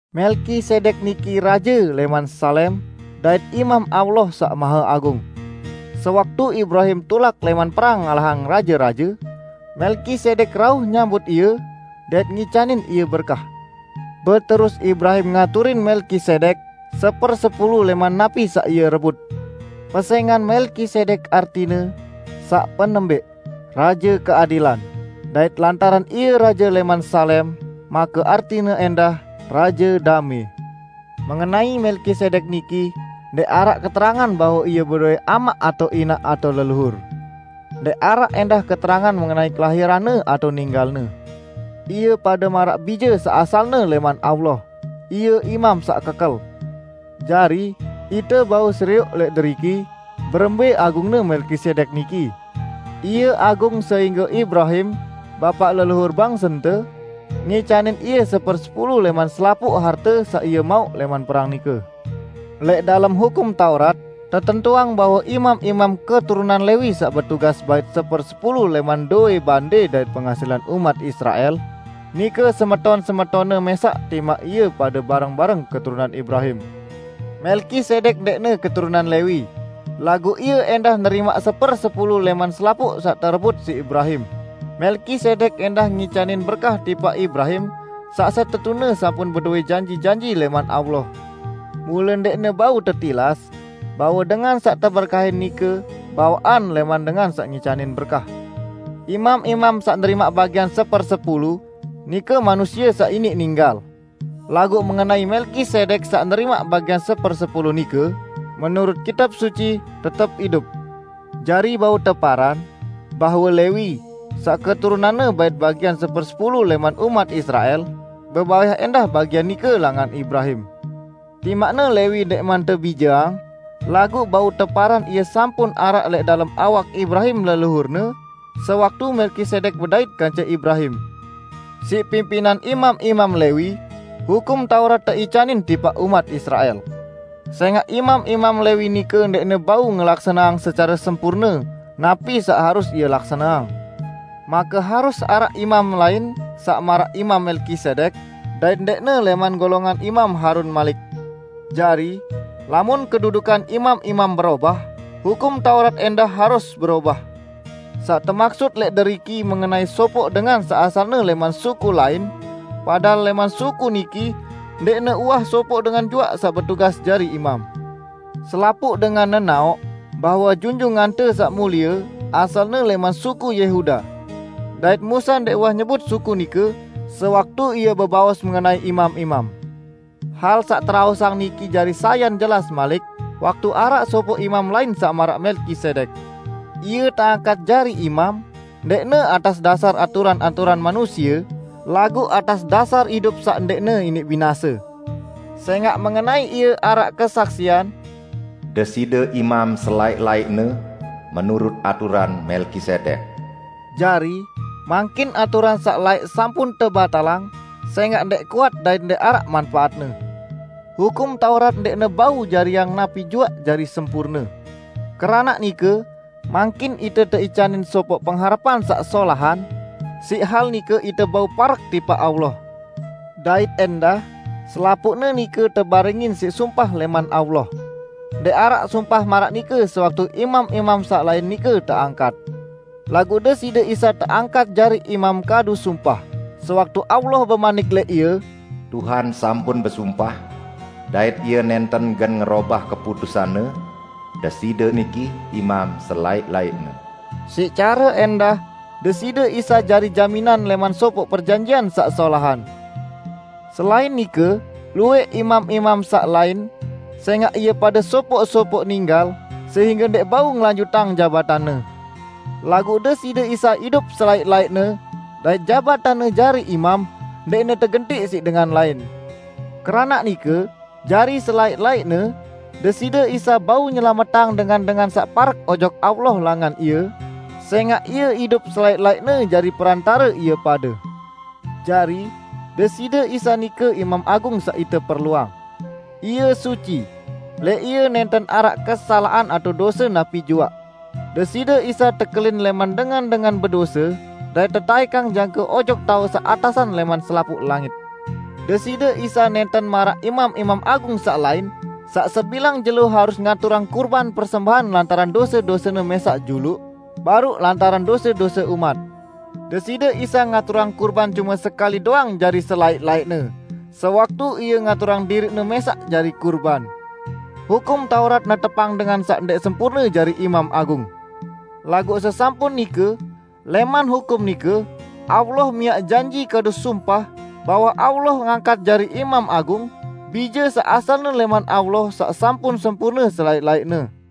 Melkisedek niki raje lẽman Salem dait imam Allah Saq Maheagung. Sewaktu Ibrahim tulak lẽman perang ngalahang raje-raje, Melkisedek rauh nyambut ie dait ngicanin ie berkah. Beterus Ibrahim ngaturin Melkisedek sepersepulu lẽman napi saq ie rebut. (Pesẽngan Melkisedek artine, saq penembẽq, "Raje Keadilan" dait lantaran Ie raje lẽman Salem, make artine ẽndah "Raje Damẽ".) Mengenai Melkisedek niki ndẽq araq keterangan bahwe ie bedowẽ amaq atao inaq atao leluhur; ndẽq araq ẽndah keterangan mengenai kelahiranne, atao ninggalne. Ie pade maraq Bije saq asalne lẽman Allah; Ie Imam saq kekel. Jari, ite bau serioq lẽq deriki berembẽ agungne Melkisedek niki; Ie agung sehingge Ibrahim, bapaq leluhur bangsente, ngicanin ie sepersepulu lẽman selapuq harte saq ie mauq lẽman perang nike. Lẽq dalem Hukum Taurat, tetentuang bahwe imam-imam keturunan Lewi saq betugas bait sepersepulu lẽman dowẽ bande dait penghasilan umat Israel, nike semeton-semetonne mẽsaq timaq ie pade bareng-bareng keturunan Ibrahim. Melkisedek ndẽqne keturunan Lewi, laguq ie ẽndah nerimaq sepersepulu lẽman selapuq saq terebut siq Ibrahim, Melkisedek ẽndah ngicanin berkah tipaq Ibrahim saq setetune sampun bedowẽ janji-janji lẽman Allah. Mule ndẽqne bau tetilas bahwe dengan saq teberkahin nike bawaqan lẽman dengan saq ngicanin berkah. Imam-imam saq nerimaq bagian sepersepulu, nike manusie saq iniq ninggal. Laguq mengenai Melkisedek saq nerimaq bagian sepersepulu nike, menurut Kitab Suci tetep idup. Jari bau teparan, bahwe Lewi -- saq keturunanne bait bagian sepersepulu lẽman umat Israel -- bebayah ẽndah bagian nike langan Ibrahim. Timaqne Lewi ndẽqman tebijeang, laguq bau teparan ie sampun araq lẽq dalem awak Ibrahim leluhurne, sewaktu Melkisedek bedait kance Ibrahim. Siq pimpinan imam-imam Lewi, Hukum Taurat teicanin tipaq umat Israel. Sẽngaq imam-imam Lewi nike ndẽqne bau ngelaksaneang secare sempurne napi saq harus ie laksaneang, make harus araq imam lain, saq maraq Imam Melkisedek, dait ndẽqne lẽman golongan Imam Harun malik! Jari, lamun kedudukan imam-imam berobah, Hukum Taurat ẽndah harus berobah. Saq temaksut lẽq deriki mengenai sopoq dengan saq asalne lẽman suku lain, padahal lẽman suku niki ndẽqne uwah sopoq dengan juaq saq betugas jari imam. Selapuq dengan nenaoq bahwe Junjungante Saq Mulie asalne lẽman suku Yehuda; dait Musa ndẽq uwah nyebut suku nike sewaktu ie bebaos mengenai imam-imam. Hal saq teraosang niki jari sayan jelas malik, waktu araq sopoq imam lain saq maraq Melkisedek. Ie teangkat jari imam, ndẽqne atas dasar aturan-aturan manusie, laguq atas dasar idup saq ndẽqne iniq binase. Sẽngaq mengenai Ie araq kesaksian, "Deside imam selaẽq-laẽqne, menurut aturan Melkisedek." Jari, mangkin aturan saq laẽq sampun tebatalang, sẽngaq ndẽq kuat dait ndẽq araq manpaatne. Hukum Taurat ndẽqne bau jariang napi juaq jari sempurne. Keranaq nike mangkin ite teicanin sopoq pengharepan saq solahan; siq hal nike ite bau parek tipaq Allah. Dait ẽndah, selapuqne nike tebarengin siq sumpah lẽman Allah. Ndẽq araq sumpah maraq nike sewaktu imam-imam saq lain nike teangkat. Laguq Deside Isa teangkat jari imam kadu sumpah, sewaktu Allah bemanik lẽq Ie, "Tuhan sampun besumpah, dait Ie nẽnten gen ngerobah keputusan-Ne, 'Deside Imam selaẽq-laẽqne.' " Siq care niki ẽndah Deside Isa jari jaminan lẽman sopoq perjanjian saq solahan. Selain nike, luwẽq imam-imam saq lain, sẽngaq ie pade sopoq-sopoq ninggal sehingge ndẽq bau ngelanjutang jabatanne. Laguq Deside Isa idup selaẽq-laẽqne, dait jabatanne jari imam ndẽqne tegentiq siq dengan lain. Keranaq nike jari selaẽq-laẽqne Deside Isa bau nyelametang dengan-dengan saq parek ojok Allah langan Ie, sẽngaq Ie idup selaẽq-laẽqne jari Perantare ie pade. Jari, Deside Isa nike Imam Agung saq ite perluang. Ie suci; lẽq Ie nẽnten araq kesalaqan atao dose napi juaq. Deside Isa tekelin lẽman dengan-dengan bedose, dait tetaẽkang jangke ojok taoq saq atasan lẽman selapuq langit. Deside Isa nẽnten maraq imam-imam agung saq lain, saq sebilang jelo harus ngaturang kurban persembahan lantaran dose-dosene mẽsaq juluq, baruq lantaran dose-dose umat. Deside Isa ngaturang kurban cume sekali doang jari selaẽq-laẽqne, sewaktu Ie ngaturang diriq-Ne mẽsaq jari kurban. Hukum Taurat netepang dengan saq ndẽq sempurne jari imam agung. Laguq sesampun nike, lẽman hukum nike, Allah miaq janji kadu sumpah bahwe Allah ngangkat jari Imam Agung, Bije saq asalne lẽman Allah saq sampun sempurne selaẽq-laẽqne.